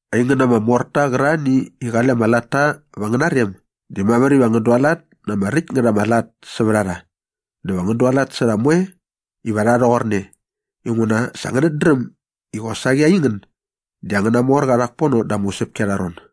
Aingän ama morta qärarhani i qale ama latta va angäna rem di mamär iva ngän dualat na ama räkt ngät ama lat sävät a rha dä va ngän dualat sä rha moe iva rha rhoqorne inguna sa ngänät dräm i qosaqi aingän di angäna morqa rhak pono da ama usäpki arha ron.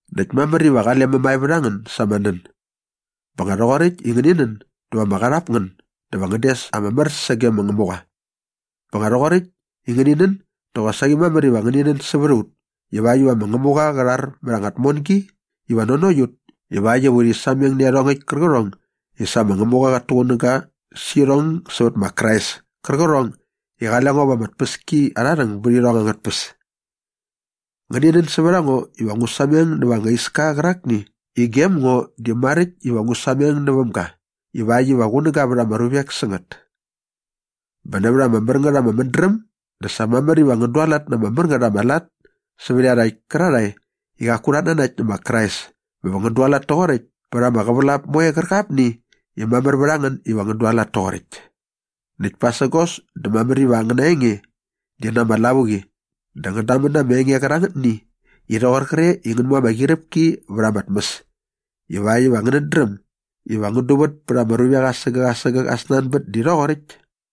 Näkt mamär iva qale mämae vät a ngän sa ama nän. Bä nga rhoqoräkt i ngäni nän dä va ama qarhap ngän dä va ngän des ama mär sage ma Ngämuqa. Bä nga rhoqoräkt i ngäni nän dä qosaqi mamär iva ngäni nän sävät a ut ivakt iva ma Ngämuqa qä rhar mät anga tmongi iva nanokt ut ivakt iva urhi sameng nä iarhongäkt kärqärhong i sa ma Ngämuqa qat tuqunäga sä irhong sävät ma Krais kärqärhong i qale ngo va ama tpäskiarharhäng bät irhong angät tpäs. Ngäni nän sävät a ngo iva ngu sameng näva ama iska qärakni i gem ngo di maräkt iva ngu sameng näväm ga ivakt iva qunäga vät ama ruvek sä ngät. Bä nävät ama mär ngät ama mädräm dä sa mamär iva ngän dualat na ama mär ngät ama lat sävät iarhakt kärarhae i qaku rhat nanakt nä ma Krais bä va ngän dualat toqoräkt pät ama qävälap moe qärqapni i mamär vät a ngän iva ngän dualat toqoräkt. Näkt pasägos dä mamär iva angäna enge di na ama lavuqi dä ngän damän na ama enge qärangätni i rhoqor qre i ngän mu ama qyiräpki vät ama tmäs ivakt iva ngänät dräm iva ngän duvät pät ama ruvek asägäk asägäk aa snanbät di rhoqoräkt.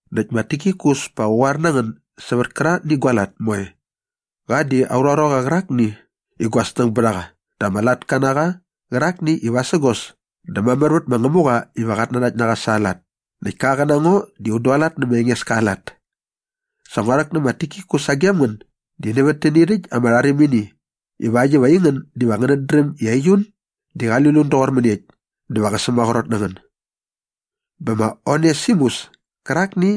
Näkt ma Tikikus pa qä qoar na ngän sävät kärangätni gua lat moe. Qa di aurha ruaqa qärakni i gua snäng bät a qa dä ama latka na qa qärakni i vasägos dä mamär vät ma Ngämuqa iva qat nanakt na qa sa aa lat näkt ka qä na ngo un dualat nä ma Engeska aa lat. Sa ngua rhäk nä ma Tikikus sagem ngän di nävät täni rhäkt ama rharimini ivakt iva aingän diva ngänät dräm i aiut di qali lut toqor mäniekt dä va qä sämaqrot na ngän. Bä ma Onesimus kärakni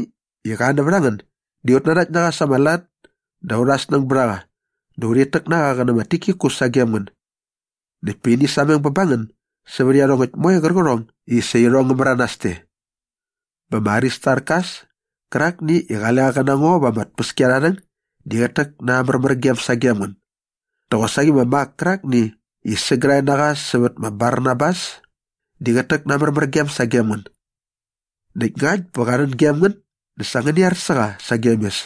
i qa nävät a ngän di ut nanakt na qa sa ama lat dä aurha snäng bät a qa dä urhit täk na qa qä nä ma Tikikus sagem ngän. Näkt pa ini sameng bä ba ngän sävät iarhongäkt moe qärqärhong i sa irhong ngä märanas te. Bä ma Aristarkas kärakni i qale qa qä na ngo va ama tpäskiarharhäng di qät täk na aa märmärgem sagem ngän. Dä qosaqi ma Mak kärakni i sägärhae na qa sävät ma Barnabas di qät täk na aa märmärgem sagem ngän. Näkt ngakt bä qa rhän gem ngän dä sa ngäni ar sä qa sagem mes.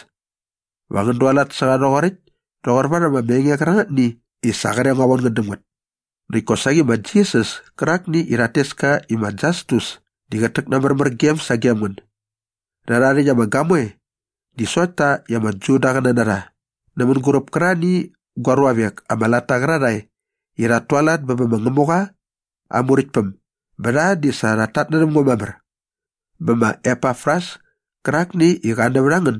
Va ngän dualat sä qa rhoqoräkt toqor varhäm ama enge qärangätni i sa qre ngua von ngän däm ngät. Näkt kosaqi ma Jisas kärakni i rhat tes ka i ma Jastus di qät täk na aa märmärgem sagem ngän. Rhärha rhäkt ama gamoe di sokt ta i ama Judaqäna na rha nä mänguräp kärarhani gua ruavek ama latta qärarhae i ut tualat bä bä ma Ngämuqa aa Muräktpäm bä rha di sa rhat tatnärhäm ngo mamär. Bä ma Epafras kärakni i qa nävät a ngän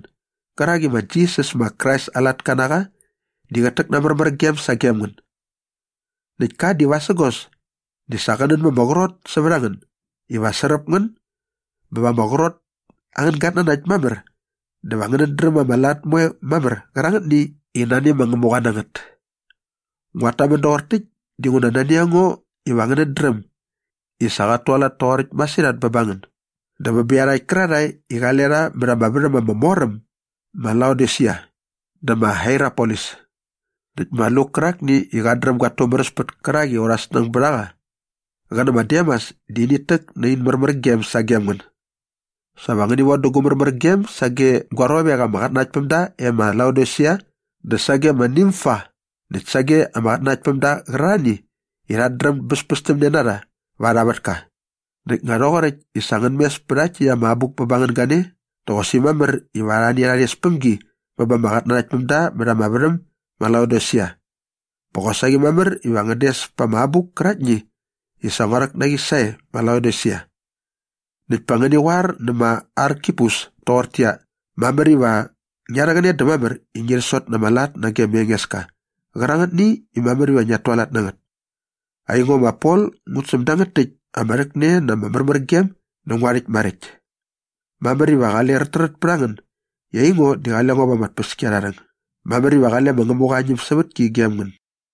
gärak i ma Jisas ma Krais aa latka na qa di qät täk na aa märmärgem sagem ngän. Näkt ka di vasägos di sa qä nän ma ama qrot sävät a ngän iva sräp ngän bä va ama qrot angän gatnanakt mamär dä va ngänät dräm ama lat moe mamär qärangätni i nani ma Ngämuqa na ngät. Nguat tamän doqor täkt dinguna nani a ngo iva ngänät dräm i sa qat tualat toqoräkt masirhat bä ba ngän dä bä bä iarhakt kärarhae i qale rha mät ama värham ama mor am ma Laodisia dä ma Hierapolis. Näkt ma Luk kärakni i qat dräm gat tumäräspät kärak i aurha snäng bät a qa qä nä ma Demas di init täk nä in märmärgem sagem ngän. Sa va ngäni von dä gu märmärgem sage gua ruavek ama qatnanaktpämda e ma Laodisia dä sage ma Nimfa näkt sage ama qatnanaktpämda qärarhani i rhat dräm bäspästämne na rha va arha vätka. Näkt nga rhoqoräkt i sa ngän mes pä rhakt täkt ama abuk bä ba ngän gane dä qosaqi mamär iva arhani rha rhes päm gi bä ba ama qatnanaktpämda mät ama värhäm ma Laodisia. Bä qosaqi mamär iva ngän des pa ama abuk käraktni i sa ngua rhäk na qi sae ma Laodisia. Näkt pa ngäni qoar nä ma Arkipus toqortäqyia, “Mamär iva ngia rhäqäne dä mamär i ngi sot na ama lat nage ma Engeska qärangätni mamär iva ngiat tualat na ngät.” Aingo ma Pol ngut säm dangät täkt ama rhäkne na ama märmärgem nä ngua rhäkt maräkt. Mamär iva qale räträt pät a ngän i aingo di qale ngo va ama tpäskiarharhäng. Mamär iva qale ma Ngämuqa aa ñämsävätki gem ngän.